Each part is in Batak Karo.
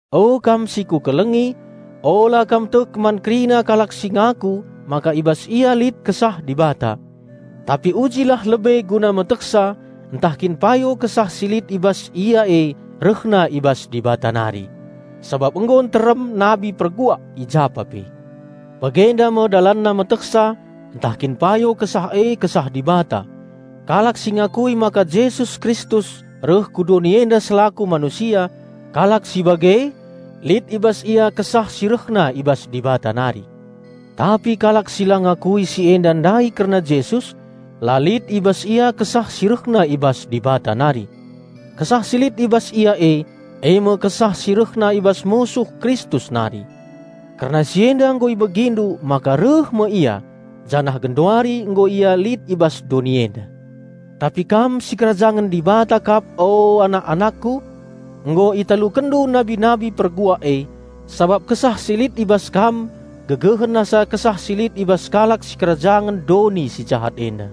O kam si kukelengi, ula kam tek man kerina kalak si ngaku maka i bas ia lit Kesah Dibata. Tapi ujilah lebe guna metehsa ntah kin payo kesah si lit i bas ia e rehna i bas Dibata nari. Sabap nggo nterem nabi perguak i japa pe. Bagenda me dalanna metehsa ntah kin payo kesah e Kesah Dibata: kalak si ngakui maka Jesus Kristus reh ku doni enda selaku manusia, kalak si bage lit i bas ia Kesah si rehna i bas Dibata nari. Tapi kalak si la ngakui si enda ndai kerna Jesus, la lit i bas ia kesah si rehna i bas Dibata nari. Kesah si lit i bas ia e, e me kesah si rehna i bas musuh Kristus nari. Kerna si enda nggo ibegindu maka reh me ia, janah genduari nggo ia lit i bas doni enda. Tapi kam sikerajangen Dibata kap, o anak-anakku. Nggo italukenndu nabi-nabi perguak e, sabap Kesah si lit i bas kam gegehen asa kesah si lit i bas kalak sikerajangen doni si jahat enda.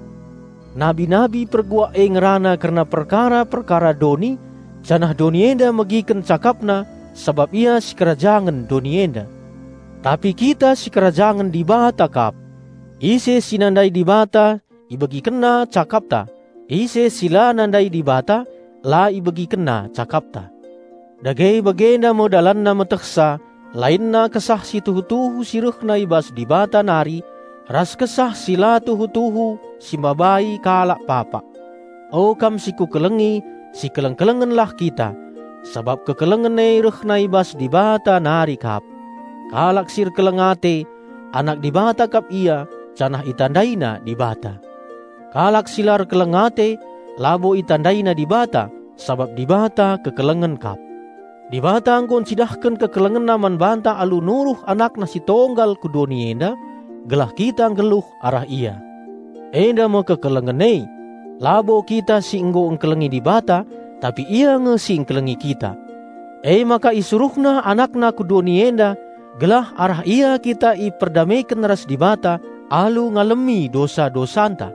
Nabi-nabi perguak e ngerana kerna perkara-perkara doni, janah doni enda megiken cakapna sabap ia sikerajangen doni enda. Tapi kita sikerajangen Dibata kap. Ise si nandai Dibata ibegikenna cakapta; ise si la nandai Dibata la ibegikenna cakapta. Dage bagenda me dalanna metehsa lainna Kesah si tuhu-tuhu si rehna i bas Dibata nari ras kesah si la tuhu-tuhu si mabai kalak papak. O kam si kukelengi, sikeleng-kelengenlah kita, sabap kekelengen e rehna i bas Dibata nari kap. Kalak si erkeleng ate, anak Dibata kap ia janah itandaina Dibata. Kalak si la erkeleng ate, labo itandaina Dibata, sabap Dibata kekelengen kap. Dibata nggo ncidahken KekelengenNa man banta alu nuruh AnakNa Si Tonggal ku doni enda, gelah kita nggeluh arah Ia. Enda me kekelengen e: labo kita si nggo ngkelengi Dibata, tapi Ia nge si ngkelengi kita. Emaka IsuruhNa AnakNa ku doni enda gelah arah Ia kita iperdameken ras Dibata alu ngalemi dosa-dosanta.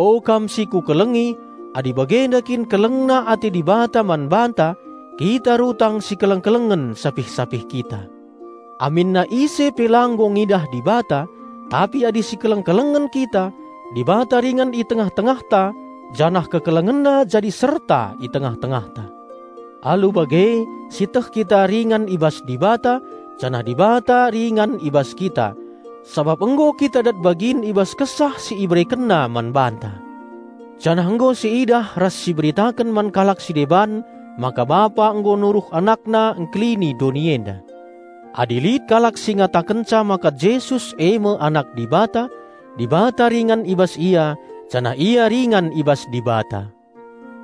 O kam si kukelengi, adi bagenda kin kelengna ate Dibata man banta, kita rutang sikeleng-kelengen sapih-sapih kita. Aminna ise pe la nggo ngidah Dibata, tapi adi sikeleng-kelengen kita, Dibata ringan i tengah-tengahta janah KekelengenNa jadi serta i tengah-tengahta. Alu bage sieteh kita ringan i bas Dibata, janah Dibata ringan i bas kita, sabap nggo kita dat bagin i bas Kesah si IberekenNa man banta. Janah nggo siidah ras siberitaken man kalak si deban maka Bapa nggo nuruh AnakNa ngkelini doni enda. Adi lit kalak si ngatakenca maka Jesus e me Anak Dibata, Dibata ringan i bas ia janah ia ringan i bas Dibata.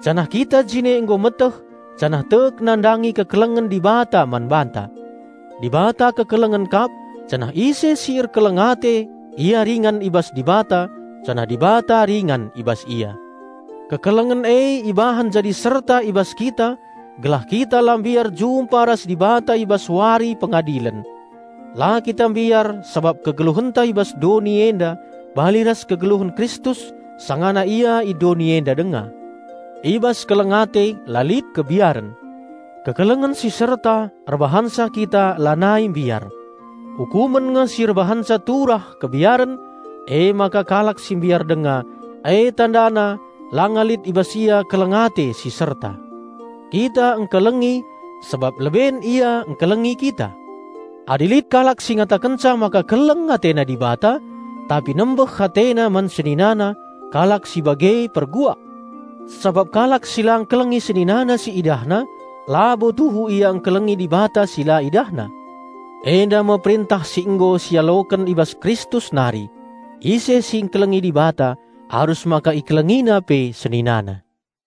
Janah kita jine nggo meteh janah tek nandangi kekelengen Dibata man banta. Dibata kekelengen kap, janah ise si erkeleng ate ia ringan i bas Dibata janah Dibata ringan i bas ia. Kekelengen e ibahan jadi serta i bas kita gelah kita la mbiar jumpa ras Dibata i bas Wari Pengadilen. La kita mbiar sabap kegeluhenta i bas doni enda bali ras kegeluhen Kristus sangana Ia i doni enda denga. I bas keleng ate la lit kebiaren. Kekelengen si serta erbahanca kita lanai mbiar. Ukumen nge si erbahanca turah kebiaren; emaka kalak si mbiar denga, e tandana langa lit i bas ia keleng ate si serta. Kita ngkelengi, sabap leben Ia ngkelengi kita. Adi lit kalak si ngatakenca maka keleng atena Dibata, tapi nembeh atena man seninana, kalak si bage perbual. Sabap kalak si la ngkelengi seninana si idahna, labo tuhu ia ngkelengi Dibata si la idahna. Enda me perentah si nggo sialoken i bas Kristus nari: ise si ngkelengi Dibata, arus maka ikelengina pe seninana.